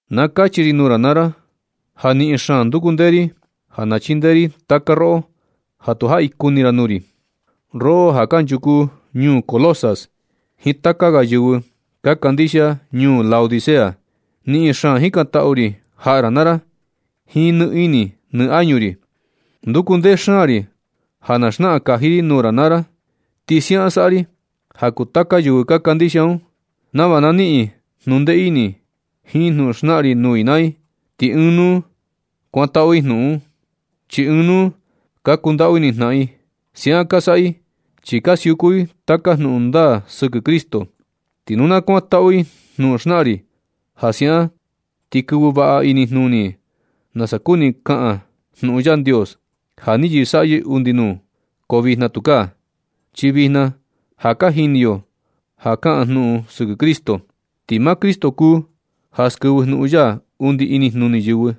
Na kachi ri nuu ra naa ra ja niꞌin xaan nduku ndee ri, ja na chindee ri taka roꞌo ja tu jaꞌi kuni ra nuu ri, roꞌo ja kunchuku ñuu Colosas jiin taka ga yɨvɨ ka kandixia ñuu Laodicea. Niꞌin xaan jikantaꞌu ri jaꞌa ra naa ra jiin nɨ ini nɨ añu ri. Nduku ndee xaan ri ja na xnaꞌan kaji ri nuu ra naa ra. Ti siaꞌan saꞌa ri ja kuu taka yɨvɨ kandixia un, nava na niꞌin i jnundee ini jiin jnuꞌun xnaꞌan ri nuu i naa i. Ti ɨɨn nuu kuantaꞌu i jnuꞌun un, chi ɨɨn nuu ka kundaꞌu ini jnaꞌan i. Siaꞌan ka saꞌa i chi ka siuku i taka jnuꞌun ndaa sɨkɨ Cristo. Ti nu na kuantaꞌu i jnuꞌun xnaꞌan ri, ja siaꞌan ti kɨvɨ vaꞌa inijnuni i nasa kuni kaꞌan jnuꞌun Yandios ja ni yɨsaꞌyɨ undi nuu. Ko vijna tukaa, chi vijna ja ka jini yo ja kaꞌan jnuꞌun sɨkɨ Cristo. Ti maa Cristo kuu ja skɨvɨ jnuꞌun ya undi inijnuni yɨvɨ,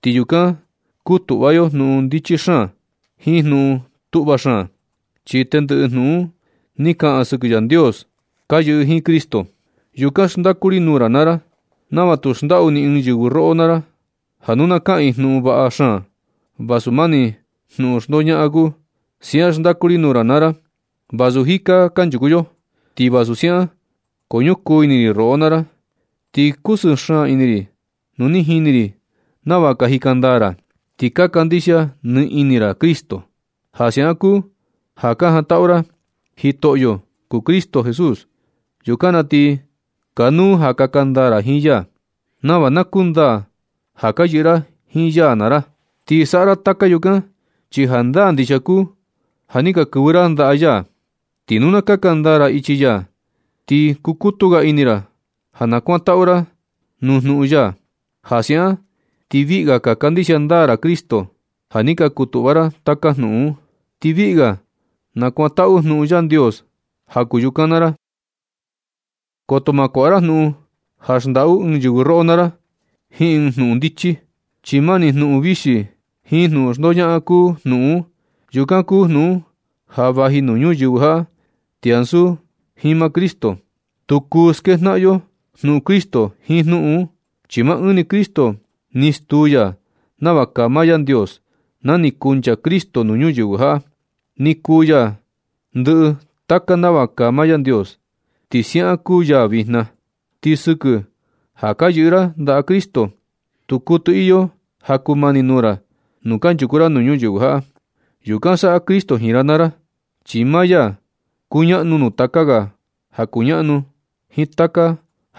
ti yukan kutuꞌva yo jnuꞌun ndichi xaan jiin jnuꞌun tuꞌva xaan, chi tendɨꞌɨ jnuꞌun ni kaꞌan sɨkɨ Yandios ka yɨꞌɨ jiin Cristo. Yukan xndaku ri nuu ra naa ra nava tu xndaꞌu ni ɨɨn yɨvɨ roꞌo naa ra, ja nu ka kaꞌan i jnuꞌun vaꞌa xaan vasu mani jnuꞌun xndoñaꞌan kuu. Siaꞌan xndaku ri nuu ra naa ra vasu jika kanchuku yo. Ti vasu siaꞌan, ko ñukuu ini ri roꞌo naa ra, ti kusɨɨ xaan ini ri nu ni jini ri nava ka jika ndaa ra, ti ka kandixia nɨ ini ra Cristo. Ja siaꞌan kuu ja ka jantaꞌu ra ja jitoꞌo ra kuu Cristo Jesús. Yukan na ti kanuu ja kaka ndaa ra jiin ya, nava na kundaa ja ka yɨꞌɨ ra jiin ya naa ra. Ti saꞌa ra taka yukan, chi jandaa ndixia kuu ja ni ka kɨvɨ ra ndaꞌa ya. Ti nu na kaka ndaa ra ichi ya, ti kukutu ga ini ra ja na kuandatu ra nuu jnuꞌun ya. Ja siaꞌan ti viꞌi ga ka kandixia ndaa ra Cristo. Ja ni ka kutuꞌva ra taka jnuꞌun un, ti viꞌi ga nakuantaꞌu nuu Yandios ja kuu yukan naa ra. Koto ma kuaꞌa ra jnuꞌun ja xndaꞌu ɨɨn yɨvɨ roꞌo naa ra jiin ɨɨn jnuꞌun ndichi, chi mani jnuꞌun vixi jiin jnuꞌun xndoñaꞌan kuu jnuꞌun un. Yukan kuu junꞌun ja vaji nuu yɨvɨ ñuyɨvɨ jaꞌa ti ansu jiin maa Cristo. Tu kuɨtɨ skejnaꞌan yo jnuꞌun Cristo jiin jnuꞌun un. Chi maa ɨɨn ni Cristo ni stuu ya nava kaa maa Yandios. Na ni kuncha Cristo nuu ñuyɨvɨ jaꞌa, ni kuu ya ndɨꞌɨ taka nava kaa maa Yandios, ti siaꞌan kuu ya vijna. Ti sɨkɨ ja ka yɨꞌɨ ra ndaꞌa Cristo, tu kuɨtɨ iyo ja kumani nuu ra nu kanchuku ra nuu ñuyɨvɨ jaꞌa. Yukan saꞌa Cristo jiin ra naa ra, chi maa ya kuñaꞌnu nuu taka ga ja ka kuñaꞌnu jiin taka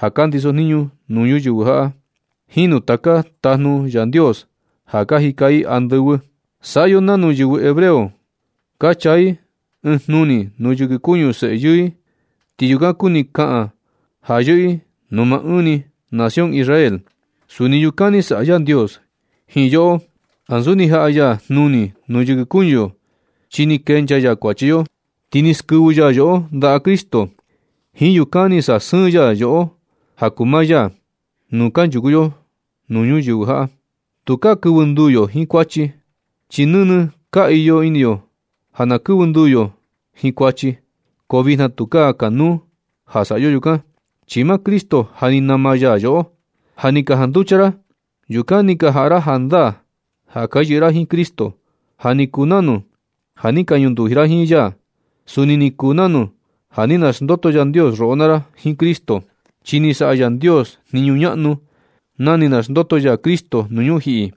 ja ka ndisojniñu nuu ñuyɨvɨ jaꞌa jiin nuu taka tajnu Yandios ja ka jika i andɨvɨ. Saꞌa yo nanu yɨvɨ hebreo ka chaa i ɨɨn jnuni nuu yɨkɨ kuñu seꞌe yɨɨ i, ti yukan kuni kaꞌan ja yɨꞌɨ i nuu maa ɨɨn ni nación Israel. Suni yukan ni saꞌa Yandios jiin yoꞌo ansu ni jaꞌa ya jnuni nuu yɨkɨ kuñu yo. Chi ni kenchaa ya kuachi yo, ti ni skɨvɨ ya yoꞌo ndaꞌa Cristo. Jiin yukan ni sasɨɨn ya yoꞌo ja kuu maa ya nu kunchuku yo nuu ñuyɨvɨ jaꞌa. Tukaa kɨvɨ nduu yo jiin kuachi. Chi nɨnɨ ka iyo ini yo ja ka kɨvɨ nduu yo jiin kuachi, ko vijna tukaa kanuu ja saꞌa yo yukan, chi maa Cristo ja ni nama ya yoꞌo. Ja ni ka janducha ra, yukan ni ka jaꞌa ra jandaa ja ka yɨꞌɨ ra jiin Cristo, ja ni kuu nanu ja ni ka ñunduji ra jiin ya. Suni ni kuu nanu ja ni naxndoto Yandios roꞌo naa ra jiin Cristo, chi ni saꞌa Yandios jniñu ñaꞌnu na ni naxndoto ya Cristo nuu ñujiꞌi,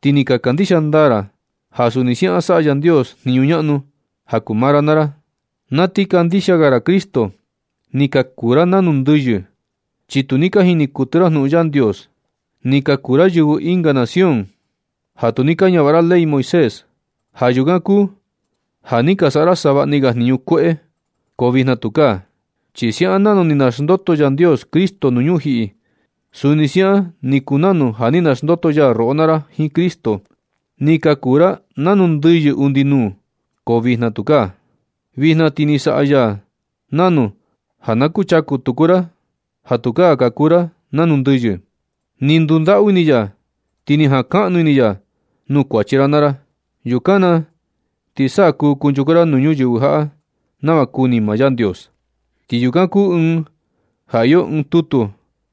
ti ni ka kandixia ndaa ra ja suni siaꞌan saꞌa Yandios jniñu ñaꞌnu ja kuu maa ra naa ra. Sa ti kandixia ga ra Cristo, ni ka kuu ra nanu ndɨyɨ, chi tu ni ka jini kuɨtɨ ra jnuꞌun Yandios. Ni ka kuu ra yɨvɨ ɨnga nación ja tu ni ka ñavaꞌa ra ley Moisés. Ja yukan kuu ni ka saꞌa ra savaꞌni ga jniñu kueꞌe. Ko tukaa vijna, chi siaꞌan nanu ni naxndoto Yandios Cristo nuu ñujiꞌi, suni siaꞌan ni kuu nanu ja ni naxndoto ya roꞌo naa ra jiin Cristo. Ni ka kuu ra nanu ndɨyɨ undi nuu, ko vijna tukaa. Vijna ti ni saꞌa ya nanu ja kuchaku ra tuku, ja tukaa ka kuu ra nanu ndɨyɨ. Ni ndundaꞌu ini ya, ti ni jankaꞌnu ini ya nuu kuachi ra naa ra. Yukan na ti sa kuu kunchuku ra nuu ñuyɨvɨ jaꞌa nava kuni maa Yandios. Ti yukan kuu ɨɨn ja iyo ɨɨn tutu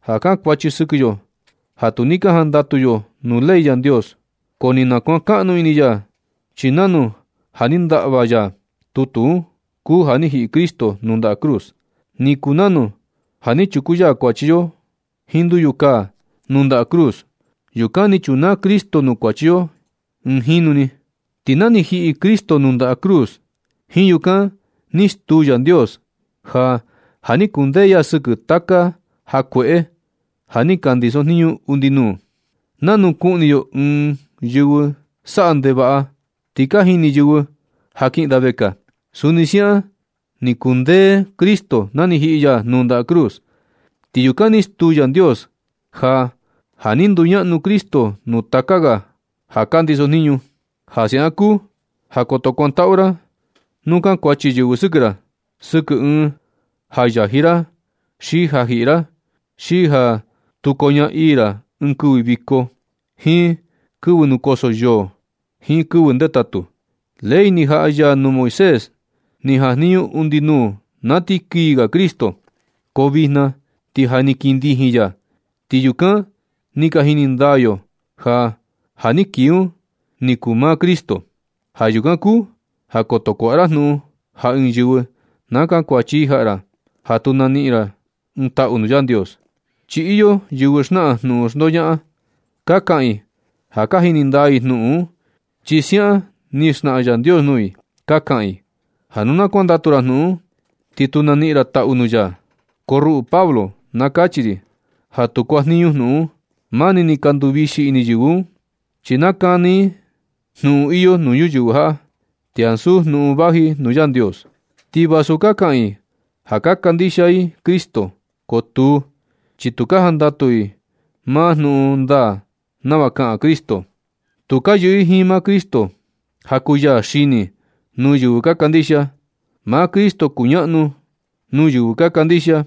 ja kankuachi sɨkɨ yo ja tu ni jandatu yo nuu ley Yandios. Ko ni nakuankaꞌnu ini ya, chi nanu ja ni ndaꞌva ya tutu un kuu ja ni jiꞌi Cristo nuu ndaꞌa cruz. Ni kuu nanu ja ni chuku ya kuachi yo jiin nduyu kaa nuu ndaꞌa cruz. Yukan ni chunaa Cristo nuu kuachi yo ɨɨn jinu ni. Ti ja ni jiꞌi Cristo nuu ndaꞌa cruz, jiin yukan ni stuu Yandios ja ja ni kundee ya sɨkɨ taka ja kueꞌe ja ni ka ndisojniñu undi nuu. Nanu kuꞌni yo ɨɨn presu ti ka jini yɨvɨ ja kiꞌin da vekaa, suni siaꞌan ni kundee Cristo na ni jiꞌi ya nuu ndaꞌa cruz. Ti yukan ni stuu Yandios ja ja ni nduñaꞌnu Cristo nuu taka ga ja ka ndisojniñu. Ja siaꞌan kuu ja koto kuantaꞌu ra nu kankuachi yɨvɨ sɨkɨ ra, sɨkɨ ɨɨn ja yaji ra xi ja jiꞌi ra, xi ja tu koñaa ii ra ɨɨn kɨvɨ viko, jiin kɨvɨ nukoso yoo, jiin kɨvɨ ndetatu. Ley ni jaꞌa ya nuu Moisés ni jajniñu undi nuu na ti kii ga Cristo. Ko vijna ti ja ni kii ndijin ya, ti yukan ni ka jini ndaa yo ja ja ni kii un ni kuu maa Cristo. Ja yukan kuu ja koto kuaꞌa ra jnuꞌun ja ɨɨn yɨvɨ na kankuachi i jaꞌa ra, ja tu naniꞌin ra ɨɨn taꞌu nuu Yandios. Chi iyo yɨvɨ xnaꞌan jnuꞌun xndoñaꞌan. Ka kaꞌan i ja ka jini ndaa i jnuꞌun un, chi siaꞌan ni xnaꞌan Yandios nuu i. Ka kaꞌan i ja nu tu kuandatu ra jnuꞌun un, ti tu na niꞌin taꞌu ra nuu ya. Ko ruꞌu Pablo, na kachi ri ja tu kuajniñu jnuꞌun un. Mani ni ka nduvixi yɨvɨ un, chi nakani ini i jnuꞌun iyo nuu ñuyɨvɨ jaꞌa, ti ansu jnuꞌun vaji nuu Yandios. Ti vasu ka kaꞌan i ja ka kandixia i Cristo, ko tuu, chi tu ka jandatu i maa jnuꞌun ndaa nava kaꞌan Cristo. Tu ka yɨꞌɨ i jiin maa Cristo, ja kuu ya xini nuu yɨvɨ ka kandixia. Maa Cristo kuñaꞌnu nuu yɨvɨ ka kandixia,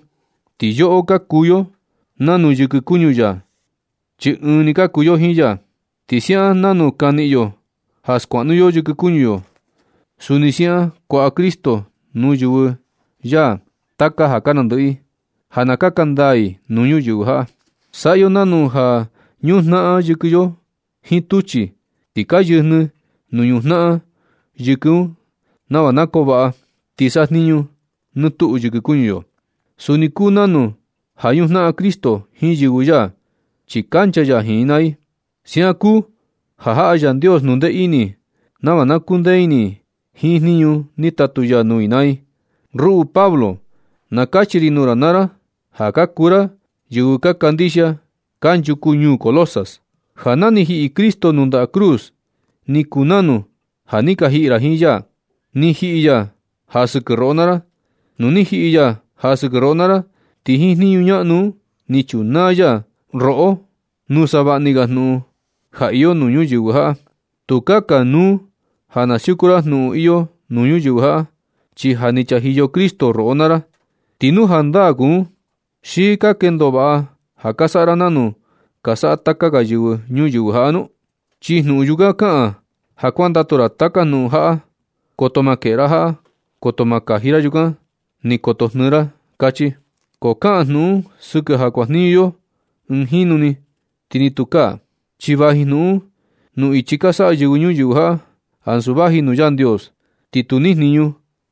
ti yoꞌo ka kuu yo nanu yɨkɨ kuñu ya, chi ɨɨn ni ka kuu yo jiin ya. Ti siaꞌan nanu ka niꞌin yo ja skuaꞌnu yo yɨkɨ kuñu yo, suni siaꞌan kuaꞌa Cristo nuu yɨvɨ ya taka ja ka nandɨꞌɨ i ja na kaka ndaa i nuu ñuyɨvɨ jaꞌa. Saꞌa yo nanu ja ñujnaꞌan yɨkɨ yo jiin tuchi, ti ka yɨjnɨ nuu ñujnaꞌan yɨkɨ un nava na koo vaꞌa ti sajniñu nɨ tuꞌu yɨkɨ kuñu yo. Suni kuu nanu ja ñujnaꞌan Cristo jiin yɨvɨ ya, chi kancha ya jiin i naa i. Siaꞌan kuu ja jaꞌa Yandios jnundee ini nava na kundee ini i jiin jniñu ni tatu ya nuu i naa i. Ruꞌu Pablo, na kachi ri nuu ra naa ra, ja ka kuu ra yɨvɨ ka kandixia kanchuku ñuu Colosas, ja na ni jiꞌi Cristo nuu ndaꞌa cruz, ni kuu nanu ja ni ka jiꞌi ra jiin ya, ni jiꞌi ya ja sɨkɨ roꞌo naa ra. Nu ni jiꞌi ya ja sɨkɨ roꞌo naa ra, ti jiin jniñu ñaꞌnu un ni chunaa ya roꞌo nuu savaꞌni ga jnuꞌun ja iyo nuu ñuyɨvɨ jaꞌa. Tukaa kanuu ja na siuku ra jnuꞌun iyo nuu ñuyɨvɨ jaꞌa, chi ja ni chajiyo Cristo roꞌo naa ra. Ti nu jandaa kuu un, ¿xi ka kendo vaꞌa ja ka saꞌa ra nanu ka saꞌa taka ga yɨvɨ ñuyɨvɨ jaꞌa nu? Chi jnuꞌun yukan kaꞌan ja kuandatu ra taka jnuꞌun jaꞌa: “Koto ma keꞌe ra jaꞌa, koto ma kaji ra yukan, ni koto jnɨɨ ra”, kachi. Ko kaꞌan jnuꞌun un sɨkɨ ja kuajniñu yo ɨɨn jinu ni ti tukaa. Chi vaji jnuꞌun un nuu ichi ka saꞌa yɨvɨ ñuyɨvɨ jaꞌa, ansu vaji nuu Yandios. Ti tu nijniñu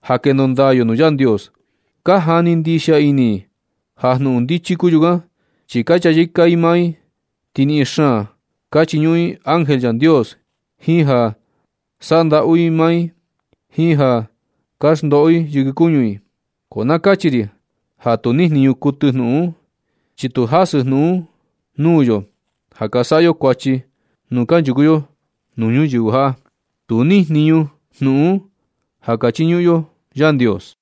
ja kendo ndaa yo nuu Yandios. Ka jani ndixia ini i ja jnuꞌun ndichi kuu yukan, chi ka chayɨka i maa i ti niꞌin xaan ka chiñuꞌun i ángel Yandios, jiin ja saꞌa ndaꞌu i maa i, jiin ja ka xndoꞌo i yɨkɨ kuñu i. Ko na kachi ri ja tu nijniñu kuɨtɨ jnuꞌun un, chi tu jasɨ jnuꞌun un nuu yo ja ka saꞌa yo kuachi nu kanchuku yo nuu ñuyɨvɨ jaꞌa. Tu nijniñu jnuꞌun un ja ka chiñuꞌun yo Yandios.